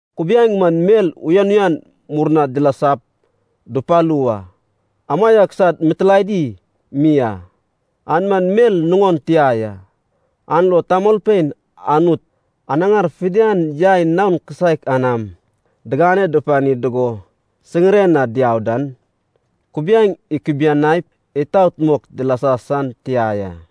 Kubiaeŋ man mel uyan uyan murna dilasap dupalu wa, amaiak sad mitilaedi mi a. An man mel nuŋon tia ya. An lo tamolpein Anut anaŋar fidian yai naon kisaek anam digane pani dugo siŋiren na diau dan, kubiaeŋ ikubuniaip itaot mok dilasa san tia ya.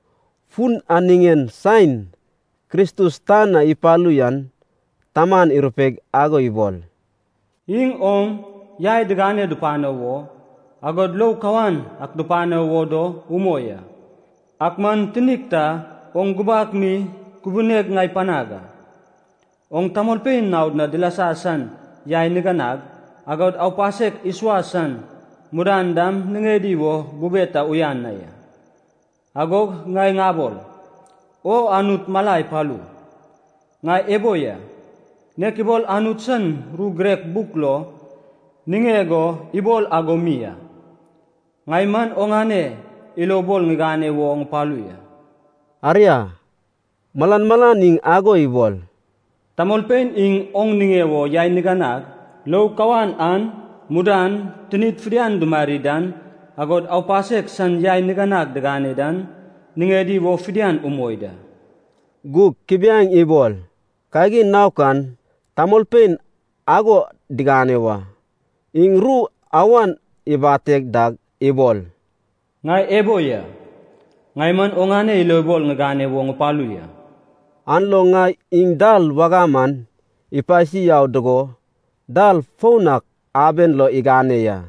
Fun an niŋen saen Kristus tan na ipalu yan Taman irupeig ago ibol, “Iŋ oŋ yai digane dupano wo, agod lou kawan ak dupano wo do umoi a. Ak man tinik ta oŋ gubak mi kubuneg ŋai panag a. Oŋ tamolpein nao na dilasa san yai niganag, agod aupasek isuas san mudan dam niŋedi wo bube ta uyan na ya. Agog ŋai ŋabol, ‘O Anut mala ipalu, ŋai ebo ya, nek ibol Anut san ru girek buk lo niŋeg o ibol ago mi a, ŋai man oŋane ilobol ŋigane wo ŋupalu ya.’” Aria, malan malan iŋ ago ibol, “Tamolpein iŋ oŋ niŋe wo yai niganag, lou kawan an, mudan tinid fidian dimari dan, agod aupasek san yai niganag digane dan niŋedi wo fidian umoi da.” (Gug kubiaeŋ ibol kagin naok an tamolpein ago digane wa.) Iŋ ru awan ibate dag ibol, “Ŋai ebo ya, ŋai man oŋane ilobol ŋigane wo ŋupalu ya.” An lo na iŋ dal wagam an ipasi yau dugo dal foun ak aben lo igane ya.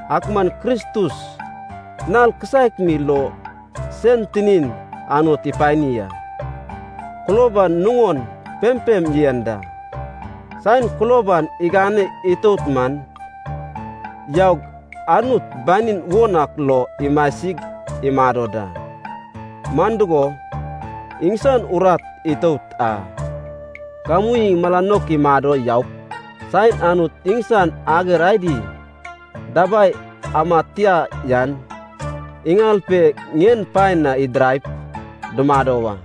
Ak man Kristus nal kisaek mi lo sen tinin Anut ipani a. Kulob an nuŋon pempem yen da. Saen kulob an igane itout man yaug Anut banin won ak lo imasig imado da. Man dugo, iŋsan urat itout a. Gamu iŋ mala naok imado yaup saen Anut iŋsan ager adi dabai amad tia yan iŋal pe ŋien paen na idiraip dumado wa.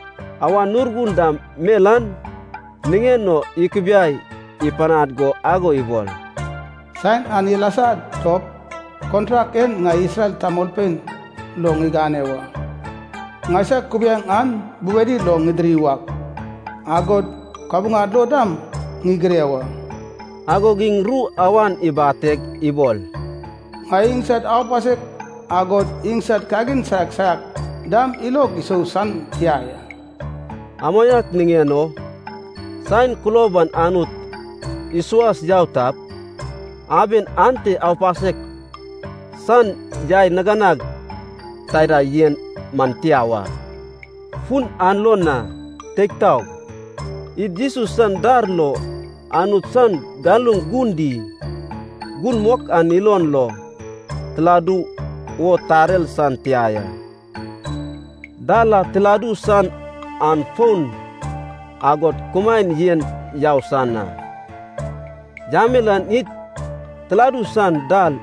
Awan Urgun dam mel an niŋen o ikubiai ipanad go ago ibol, “Saen an ilasa dop, kontrak en ŋai Isrel tamolpein lo ŋigane wa. Ŋaisag kubiaeŋ an bubedi lo ŋidiri wak, agod kabuŋad lo dam ŋigire wa.” Agog iŋ ru awan ibateg ibol, “Ŋai iŋsad aupasek agod iŋsad kagin saiak saiak dam ilog isou san tia ya.” Amaiak niŋen o, saen kulob an Anut isuas yau tap, aben ante aupasek san yai niganag taida yen man tia wa. Fun an lo na, teig taog, id Jesus san dar lo Anut san galuŋ Gun Di, Gun Mok an ilon lo tiladu wo tarer san tia ya. Dal a tiladu san an foun, agod kumaen yen yau san a. Yamel an id tiladu san dal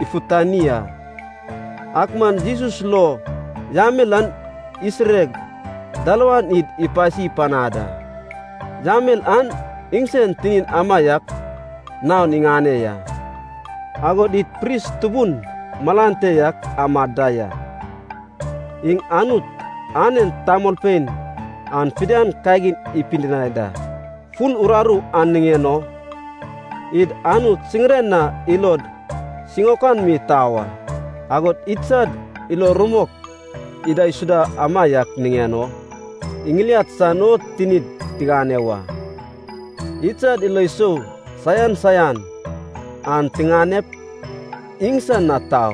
ifutani a, ak man Jesus lo yamel an isireig dalawan id ipasi panad a. Yamel an iŋsen tinin amaiak naon iŋane ya. Agod id pris tubun malan te yak amad da ya, iŋ Anut anen tamolpein an fidian kagin ipidinai da. Fun uraru an niŋen o id Anut siŋiren na ilod siŋaokan mi tau a. Agod idsad ilo rumok idaisuda amaiak niŋen o iŋiliad san o tinid tigane wa. Idsad ilo sou saian saian an tiŋanep iŋsan na tau,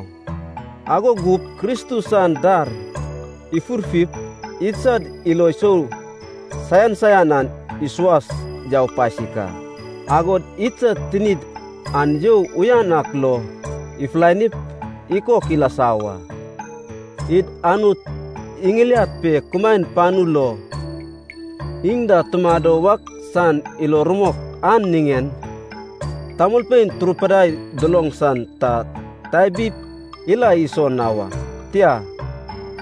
ago gup Kristus san dar ifurfip idsad ilo sou saian saian an isuas yau pasik a. Agod idsad tinid an you uyan ak lo ifulanip ikok ilasa wa. Id Anut iŋiliad pe kumaen panu lo, iŋ da tumado wak san ilo rumok an niŋen tamolpein turupidai duloŋ dan ta tabip ila iso na wa, tia,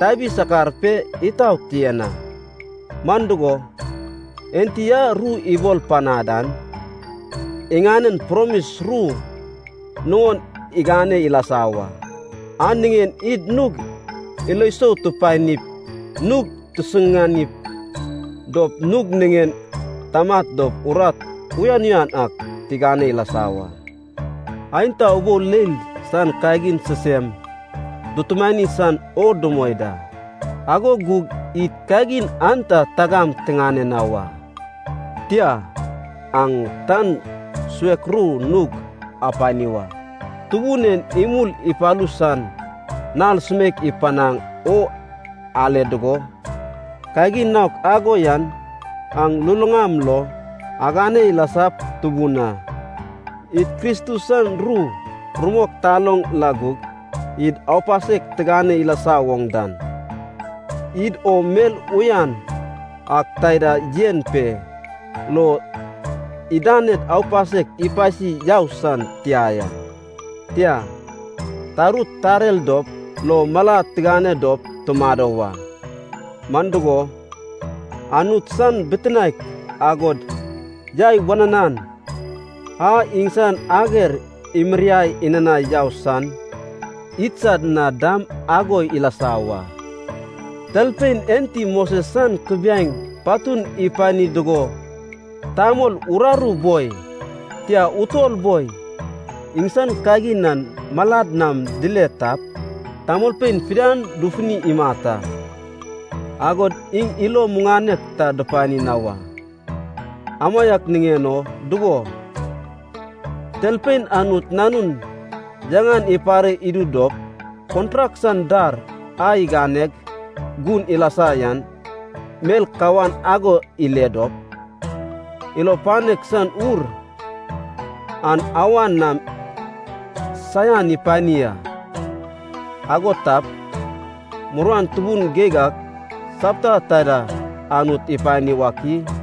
tabi sakar pe itaot yen a. Man dugo, Enti a ru ibol panad an, iŋanen promis ru nuŋon igane ilasa wa. An niŋen id nug ilo sou tupanip nug tisusuŋani dop nug niŋen tamat dop urat uyan uyan ak tigane ilasa wa. Aenta ubou leil san kagin sisem dutumani san o dumoi da, ago gug id kagin an ta tagam tiŋane na wa. Tia, aŋ tan suek ru nug apani wa, Tubun en imul ipalu san Nal sumeik ipanaŋ o ale dugo, kagin naok ago yan aŋ luluŋam lo agane ilasap tubun a. Id Kristus san ru rumok taloŋ la gug id aupasek tigane ilasa woŋ dan, id o mel uyan ak taida yen pe lo idaned aupasek ipasi yau san tia ya. Tia, tarut tarer dop, lo malad tigane dop tumado wa, man dugo, Anut san bitinaek agod yai wananan a iŋsan ager imiriai inanai yau san idsad na dam ago ilasa wa. Talpein enti Moses san kubiaeŋ patun ipani dugo tamol uraru boi, tia utol boi, iŋsan kagin an malad nam dile tap, tamolpein fidian dufuni imat a, agod iŋ ilo muŋanek ta dupani na wa. Amaiak niŋen o dugo, talpein Anut Nanun yaŋan ipare idu dop, kontrak san dar a iganeg gun ilasa yan mel kawan ago ile dop, ilo panek san Ur an awan nam saian ipani a, ago tap, muruan tubun geig ak sapta taida Anut ipani wak i?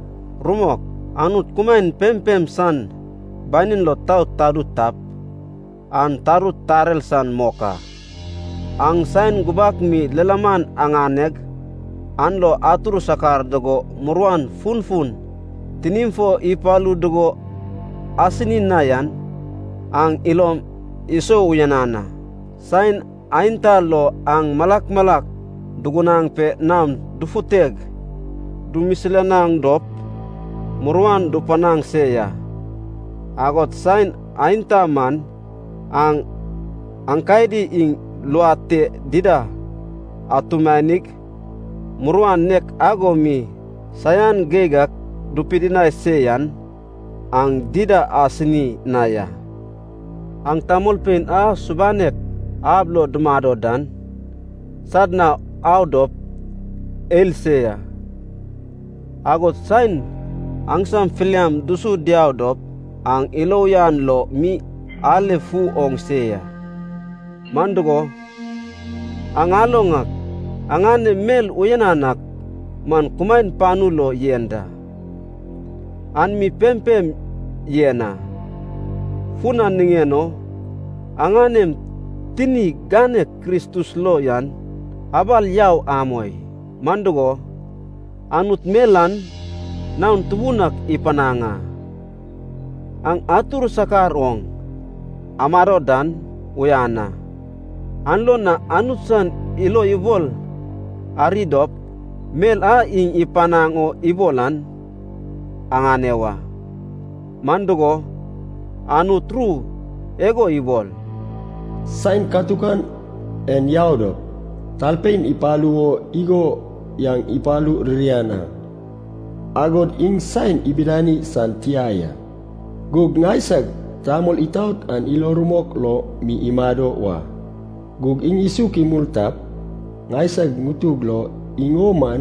Rumok, Anut kumaen pempem san banin lo tau tadu tap, an tarut tarer san mok a. Aŋ saen gubak mi lilaman aŋaneg, an lo atur sakar dugo muruan funfun tinim fo ipalu dugo asini na yan, aŋ ilom isou uyanan a. Saen aenta lo aŋ malak malak dugunaŋ pe naom dufuteg dumisilanaŋ dop muruan dupanaŋ se ya. Agod saen aenta man aŋ aenkadi iŋ luad te dida atumanig, muruan nek ago mi saian geig ak dupidinai se yan, aŋ dida asini na ya. Aŋ tamolpein a subanek ab lo dumado dan sad na au dop ael se ya. Agod saen aŋsam filiam dusu diau dop aŋ ilo uyan lo mi aelafu oŋ se ya. Man dugo, aŋ aloŋ ak aŋanem mel uyanan ak man kumaen panu lo yen da, an mi pempem yen a. Fun an niŋen o aŋanem tini ganek Kristus lo yan abal yau amoi. Man dugo, Anut mel an naon tubun ak ipanaŋ a. Aŋ atur sakar oŋ amado dan uyan a. An lo na Anut san ilo ibol ari dop mel a iŋ ipanaŋ o ibol an aŋane wa. Man dugo, Anut ru igo ibol, “Saen katukan en yau dop, talpein ipalu wo igo yan ipalu ririan a, agod iŋ saen ibidani san tia ya. Gug ŋaisag tamol itaot an ilo rumok lo mi imado wa, gug iŋ isuk imul tap, ŋaisag ŋutug lo iŋ o man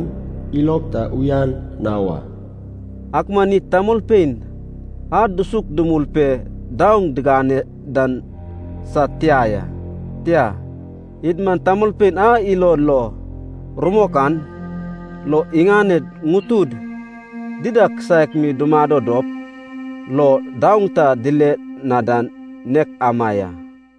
ilog ta uyan na wa.” Ak man id tamolpein a dusuk dumul pe daoŋ diŋane dan sad tia ya. Tia, id man tamolpein a ilo lo rumok, an lo iŋaned ŋutud dida kisaek mi dumadop lo daoŋ ta dile na dan nek ama ya.